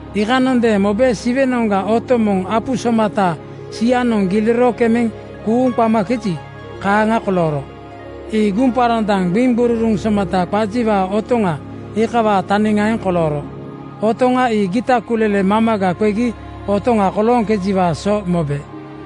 Iikanondeeŋ mobe Siwenoŋga otoŋ moŋ apu somata sianoŋ giliro kemeŋ kuuŋ qamakeji, kaaŋa kolooro. Ii guŋparandaŋ gbiŋgururuŋ somata qajiwaa otoŋa iikawaa taniŋaeŋ kolooro. Otoŋa ii gita kulele mamaga qegi otoŋa kolooŋkejiwaa so mobe.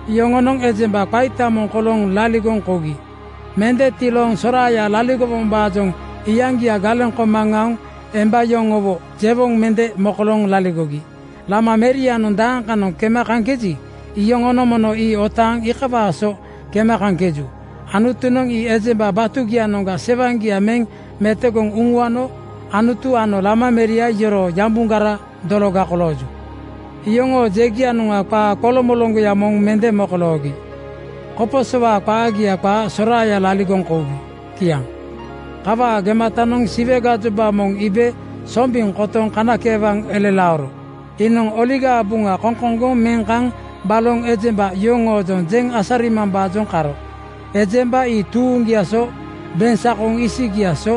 Yoŋonoŋ ejemba qaita moŋ kolooŋ laligoŋ kougi. Mende tilooŋ soraaya laligowombaajoŋ iyaŋgia galeŋ koma aoŋ emba yoŋowo jewoŋ mende mokolooŋ laligogi. Lama merianoŋ dakanoŋ kema kaŋkeji, iyoŋonoŋ mono ii otaaŋ iikawaa so kema kaŋkeju. Anutunoŋ ii ejemba batugianoŋga sewaŋgia meŋ metogoŋ uŋuano Anutu ano Lama meria yoroo yambugara dologa kolooju. Yoŋoo jegianoŋa qaa qoloŋmoloŋgoya moŋ mende mokoloogi koposowaa qaagia qaa soraaya laligoŋ kougi. Kiaŋ. Kawaa gematanoŋ Siwe gajoba moŋ iibe sombiŋ kotoŋ kanakeewaŋ elelaoro. Iinoŋ Oligaa Buŋa koŋkoŋgoŋ meŋ kaŋ baloŋ ejemba yoŋoojoŋ jeŋ asarimambaajoŋ karo. Ejemba ii tuuŋgiaa so, beŋsakoŋ isigiaa so,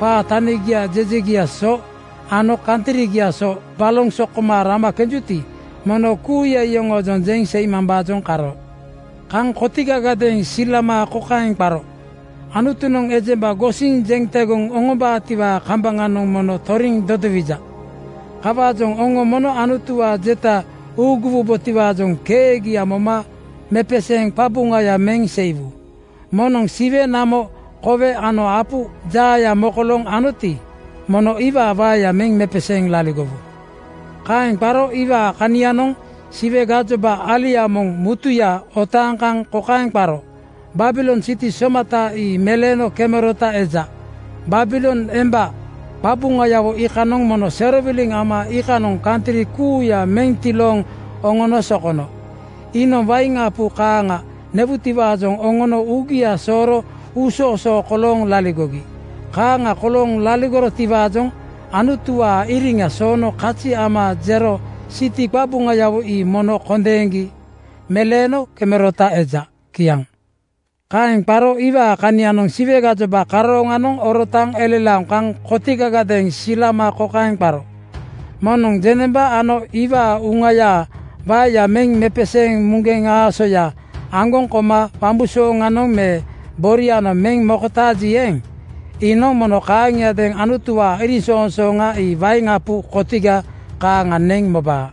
qaa tania jejegiaa so ano kantrigiaa so baloŋ sokoma rama kenjuti, mono kuuya iyoŋoojoŋ jeŋ seimambaajoŋ karo. Kaŋ kotigagadeeŋ silama kokaeŋ qaro, “Anutunoŋ ejemba gosiŋ jeŋ tegoŋ oŋombaatiwaa kambaŋanoŋ mono toriŋ dodowija. Kawaajoŋ oŋo mono Anutuwaa jeta uuguwombotiwaajoŋ keegia moma mepeseeŋ qabuŋaya meŋ seiwu. Moŋnoŋ siwe, namo, kowe ano apu jaaya mokolooŋ oŋonoti, mono iwaa waeya meŋ mepeseeŋ laligowu.” Kaeŋ qaro iwaa kanianoŋ Siwe gajoba alia moŋ mutuya otaaŋ kaŋ kokaeŋ qaro, “Babilon siti somata ii meleeno kemerota eja. Babilon emba qabuŋayawo iikanoŋ mono serowiliŋ ama iikanoŋ kantri kuuya meŋ tilooŋ oŋono sokono. Iinoŋ wain apu kaaŋa newutiwaajoŋ oŋono uugia sooro uusoosoo kolooŋ laligogi. Kaaŋa kolooŋ laligorotiwaajoŋ Anutuwaa iriŋa soono kazi ama jero siti qabuŋayawo ii mono kondeeŋgi meleeno kemerota eja.” Kiaŋ. Kaeŋ qaro iwaa kanianoŋ Siwe gajoba karooŋanoŋ orotaaŋ elelaoŋ kaŋ kotigagadeeŋ silama kokaeŋ qaro, “Moŋnoŋ jeŋnemba ano iwaa uŋayaa waeya meŋ mepeseeŋ muŋgeŋ aasoya aŋgoŋ koma wambusooŋanoŋ me borianoŋ meŋ mokotaaji eeŋ, iinoŋ mono kaaŋiadeeŋ Anutuwaa iriŋsoŋsooŋa ii wain apu kotiga kaaŋa neŋ mobaa.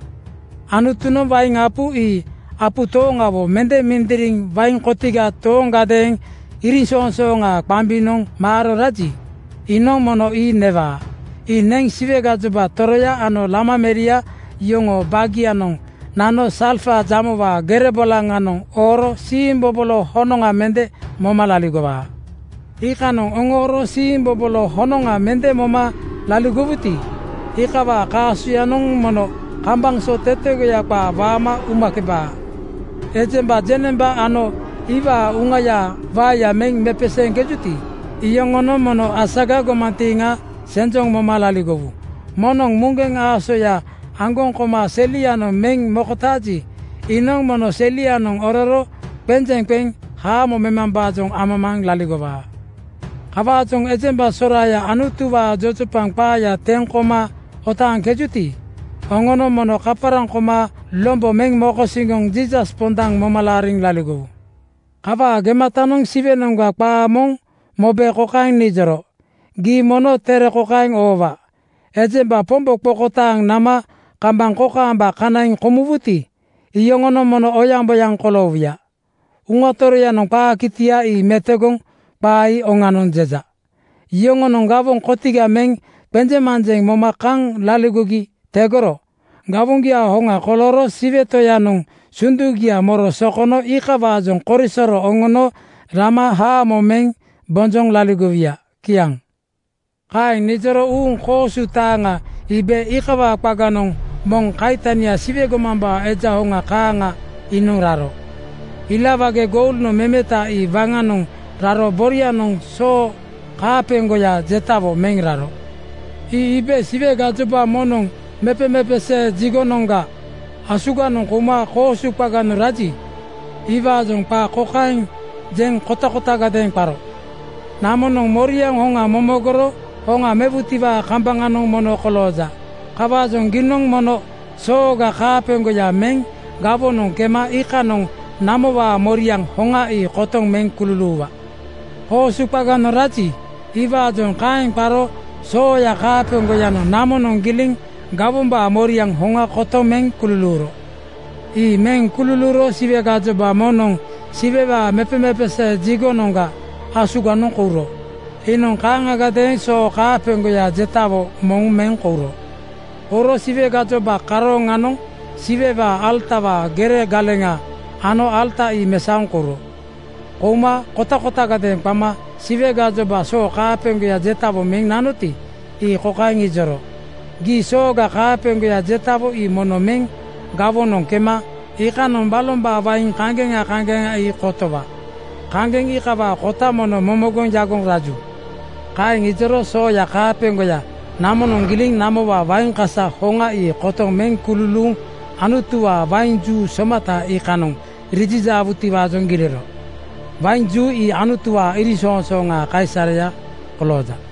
Anutunoŋ wain apu ii apu tooŋawo mende mindiriŋ wain kotiga tooŋgadeeŋ iriŋsoŋsooŋaa qambinoŋ maaro raji, iinoŋ mono ii newaa. Ii neŋ Siwe gajoba toroya ano Lama meria yoŋoo baagianoŋ nano salfa jamowaa gere bolaŋanoŋ ooro siimbobolo honoŋa mende moma laligowaa. “Iikanoŋ oŋooro siimbobolo honoŋa mende moma laligowuti, iikawaa kaasoyanoŋ mono kambaŋ so tetegoya qaa waama umakebaa. Ejemba jeŋnemba ano iwaa uŋayaa waeya meŋ mepeseeŋkejuti, iyoŋonoŋ mono asaga gomantiiŋa senjoŋ moma laligowu. Moŋnoŋ muŋgeŋ aasoya aŋgoŋ koma selianoŋ meŋ mokotaaji, iinoŋ mono selianoŋ ororo qenjeŋ qeŋ haamo memambaajoŋ amamaaŋ laligowaa.” Kawaajoŋ ejemba soraaya Anutuwaa jojopaŋ qaaya teŋ koma otaaŋkejuti, oŋonoŋ mono kaparaŋ koma lombo meŋ mokosiŋgoŋ Jiisas pondaŋ moma laariŋ laligowu. Kawaa gematanoŋ Siwenoŋga qaa moŋ mobe kokaeŋ nijoro, “Gii mono tere kokaeŋ oowa: Ejemba Pombo qokotaaŋ nama kambaŋ kokaamba kanaiŋ komuwuti, iyoŋonoŋ mono oyaŋboyaŋ koloowuya. Uŋa Toroyanoŋ qaa kitia ii metogoŋ ‘Qaa ii oŋanoŋ,’ jeja. Yoŋonoŋ gawoŋ kotiga meŋ qenjeŋmanjeŋ moma kaŋ laligogi tegoro gawoŋgiaa hoŋa kolooro Siwe Toyanoŋ sundugia moro sokono iikawaajoŋ korisoro oŋono rama haamo meŋ bonjoŋ laligowuya.” Kiaŋ. Kaeŋ nijoro uuŋ koosu taaŋa iibe iikawaa qaganoŋ moŋ kaitania Siwe gomambaa Eja hoŋa kaaŋa iinoŋ raro. Ila wage goulnoŋ memeta ii waŋanoŋ raro borianoŋ soo kaapeŋgoya jetawo meŋ raro. Ii iibe Siwe gajoba moŋnoŋ mepemepesee jigonoŋga (tempel) asuganoŋ kouma koosu qaganoŋ raji, iwaajoŋ qaa kokaeŋ jeŋ kotakotagadeeŋ qaro, “Namonoŋ moriaŋ hoŋa momogoro hoŋa mewutiwaa kambaŋanoŋ mono kolooja. Kawaajoŋ giinoŋ mono sooga kaapeŋgoya meŋ gawonoŋ kema iikanoŋ namowaa moriaŋ hoŋa ii kotoŋ meŋ kululuuwa.” Koosu qaganoŋ raji, iwaajoŋ kaeŋ qaro sooya kaapeŋgoyanoŋ namonoŋ giliŋ gawombaa moriaŋ hoŋa kotoŋ meŋ kululuuro. Ii meŋ kululuuro Siwe gajoba moŋnoŋ Siwewaa mepemepesee jigonoŋga (tempel) asuganoŋ kouro. Iinoŋ kaaŋagadeeŋ soo kaapeŋgoya jetawo moŋ meŋ kouro. Kouro Siwe gajoba karooŋanoŋ Siwewaa alatawaa gere galeŋa ano alata ii mesaoŋ kouro. Kouma kotakotagadeeŋ qama Siwe gajoba soo kaapeŋgoya jetawo meŋ nanoti, ii kokaeŋ ijoro, “Giinoŋ sooga kaapeŋgoya jetawo ii mono meŋ gawonoŋ kema iikanoŋ balombaa wain kaŋgeŋa kaŋgeŋa ii kotowa. Kaŋgeŋ iikawaa kota mono momogoŋ yagoŋ raju.” Kaeŋ ijoro sooya kaapeŋgoya namonoŋ giliŋ namowaa wain kasa hoŋa ii kotogoŋ meŋ kululuuŋ Anutuwaa wain juu somata iikanoŋ rijijaawutiwaajoŋ giliro. Wain juu ii Anutuwaa iriŋsoŋsooŋaa kaisareya kolooja.